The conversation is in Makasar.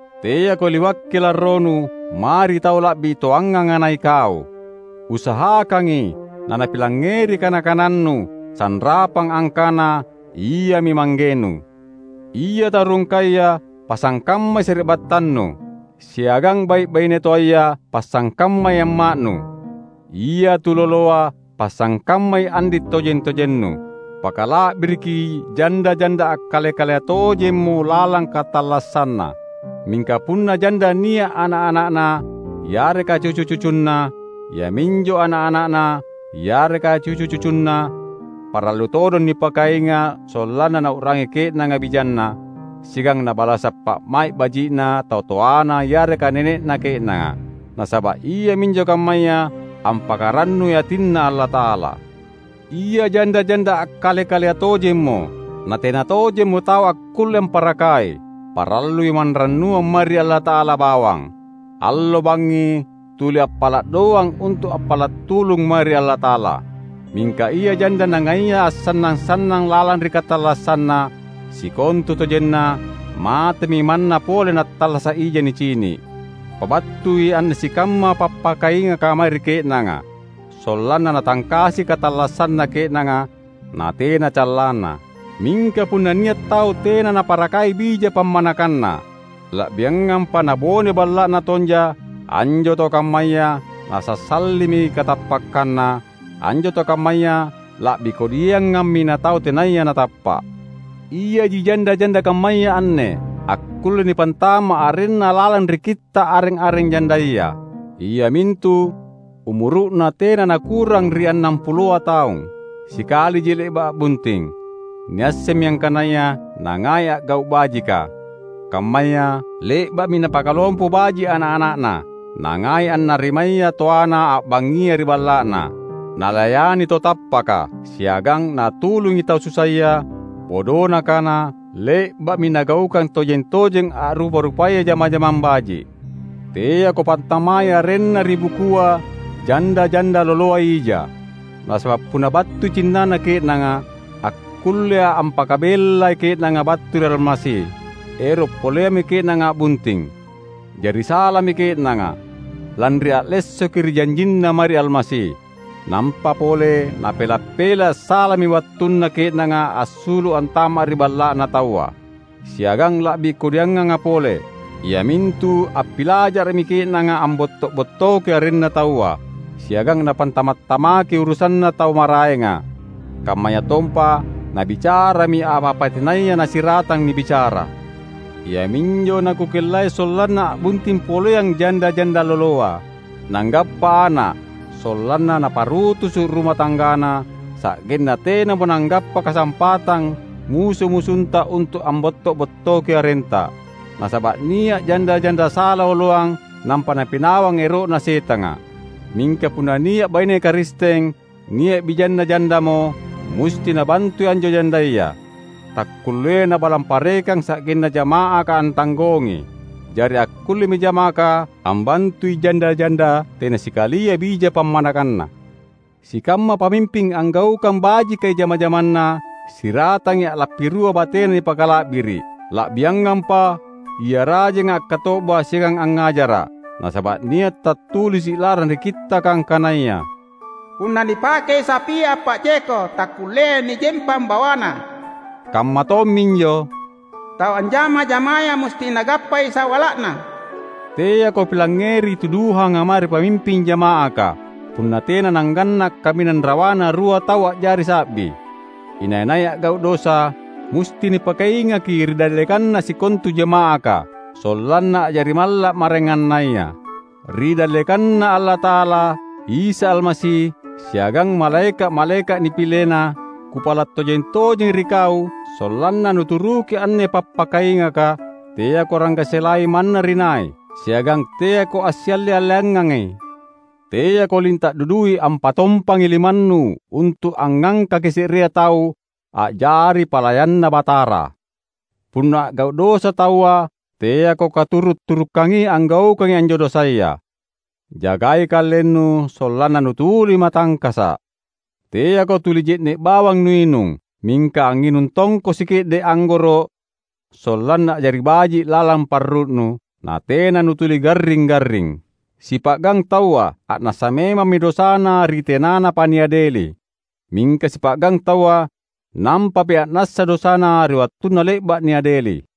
Teako liwakki larronu mae ri tau la’bi toanganga na ikau. Usahakangi nanapilangngeri kana-kanannu sanrapang angkana iami manggenu. Ia tau rungkaya pasangkammai sari’battannu; siagang bai’-baine toaya pasangkammai amma’nu. Ia tuloloa pasangkammai andi’ tojeng-tojennu. Pakala’biriki janda-janda akkale-kalea tojemmo lalang katallassanna. Mingka punna janda nia’ ana’-ana’na yareka cucu-cucunna, iaminjo ana’-ana’na yareka cucu-cucunna parallu todong nipakainga’ sollanna nau’rangi ke’nanga bijanna, siagang nabalasa’ pa’mai’ baji’na tau toana yareka nene’na ke’nanga. Nasaba’ iaminjo kammaya ampakarannui atinNa Allata’ala. Ia janda-janda akkale-kalea tojemmo, natena tojemmo tau akkulle amparakai, parallui manrannuang mae ri Allata’ala bawang. Allo bangngi tuli appala’ doang untu’ appala’ tulung mae ri Allata’ala. Mingka ia janda nangaia assannang-sannang lalang ri katallassanna, sikontutojenna matemi manna pole nattallasa’ ija nicini’. Pabattui anne sikamma pappakaingaka mae ri ke’nanga, sollanna natangkasi katallassanna ke’nanga, natena callanna. Mingka punna nia’ tau tena naparakai bija pammanakanna, la’biangampa nabone balla’na tonja, anjo tau kammaya nasassalimi katappakkanna; anjo tau kammaya la’bi kodiangammi natau tenaya natappa’. Iaji janda-janda kammaya anne akkulle nipantama’ arenna lalang ri kitta’ areng-areng jandaya, iamintu: umuru’na tena nakurang ri annampuloa taung, sikaliji le’ba’ a’bunting, niassemmi angkanaya nangai a’gau’ bajika, kammaya: le’ba’mi napakalompo baji’ ana’-ana’na, nangai annarimaya toana a’bangngi ri balla’na, nalayani tau tappaka, siagang natulungi tau susaya; bodona kana, le’ba’mi nagaukang tojeng-tojeng a’rupa-rupaya jama-jamang baji’. Teako pantamai arenna ri bukua janda-janda loloa ija. Nasaba’ punna battui cinnana ke’nanga, akkullea ampakabellai ke’nanga battu ri Almasi, ero’ poleammi ke’nanga a’bunting. Jari salami ke’nanga lanri allessoki ri janjinna mae ri Almasi. Nampa pole napela’-pela’ salami wattunna ke’nanga assulu’ antama’ ri balla’na taua. Siagang la’bi kodianganga pole, iamintu appilajara’mi ke’nanga ambotto’-bottoki arenna taua; siagang napantama’-tamakki urusanna tau maraenga, kammayatompa nabicarami apa-apa tenaya nasiratang nibicara. Iaminjo nakukellai sollanna a’bunting poleang janda-janda loloa, nanggappa ana’, sollanna naparutusu’ ruma tanggana; sa’genna tenamo nanggappa kasampatang musu-musunta untu’ ambotto’-bottoki arenta. Nasaba’ nia’ janda-janda sala oloang nampa napinawang ero’na Setanga. Mingka punna nia’ baine Karisteng nia’ bijanna jandamo, musti nabantui anjo jandaya. Takkulleai nabalang parekang sa’genna jama’aka antanggongi. Jari akkullemi jama’aka ambantui janda-janda tena sikalia bija pammanakanna. Sikamma pamimping anggaukang bajikai jama-jamanna siratangi a’lappi rua batena nipakala’biri’, la’biangampa ia rajenga akkato’ba siagang angngajara’. Nasaba’ nia’ tattulisi’ lalang ri Kittaka angkanaya, "Punna nipakei sapia appa’jeko takkulleai nijempang bawana"; kamma tomminjo, "Tau anjama-jamaya musti nagappai sawala’na". Teako pilangngeri tuduhanga mae ri pamimping jama’aka, punna tena nangganna’ kaminang rawana rua tau a’jari sa’bi. Inai-nai a’gau’ dosa, musti nipakaingaki ri dallekanna sikontu jama’aka, sollanna a’jari malla’ maraengannaya. Ri dallekanNa Allata’ala, Isa Almasi, siagang malaeka’-malaeka’ nipileNa, kupala’ tojeng-tojengi ri kau sollanna nuturuki anne pappakaingaka; teako ranggaselai manna ri nai, siagang teako assialle-alleangangi. Teako linta’ dudui ampatompangi limannu untu’ angngangkaki se’rea tau a’jari palayanNa Batara. Punna a’gau’ dosa taua teako katuru’-turukangi anggaukangi anjo dosaya. Jagai kalennu sollanna nutuli matangkasa’. Teako tuli je’ne’ bawang nuinung; mingka angnginung tongko sike’de’ anggoro’ sollanna a’jari baji’ lalang parru’nu, natena nutuli garring-garring. Sipa’gang taua a’nassa memammi dosana ri tenanapa niadeli. Mingka sipa’gang taua nampami a’nassa dosana ri wattunna le’ba’ niadeli.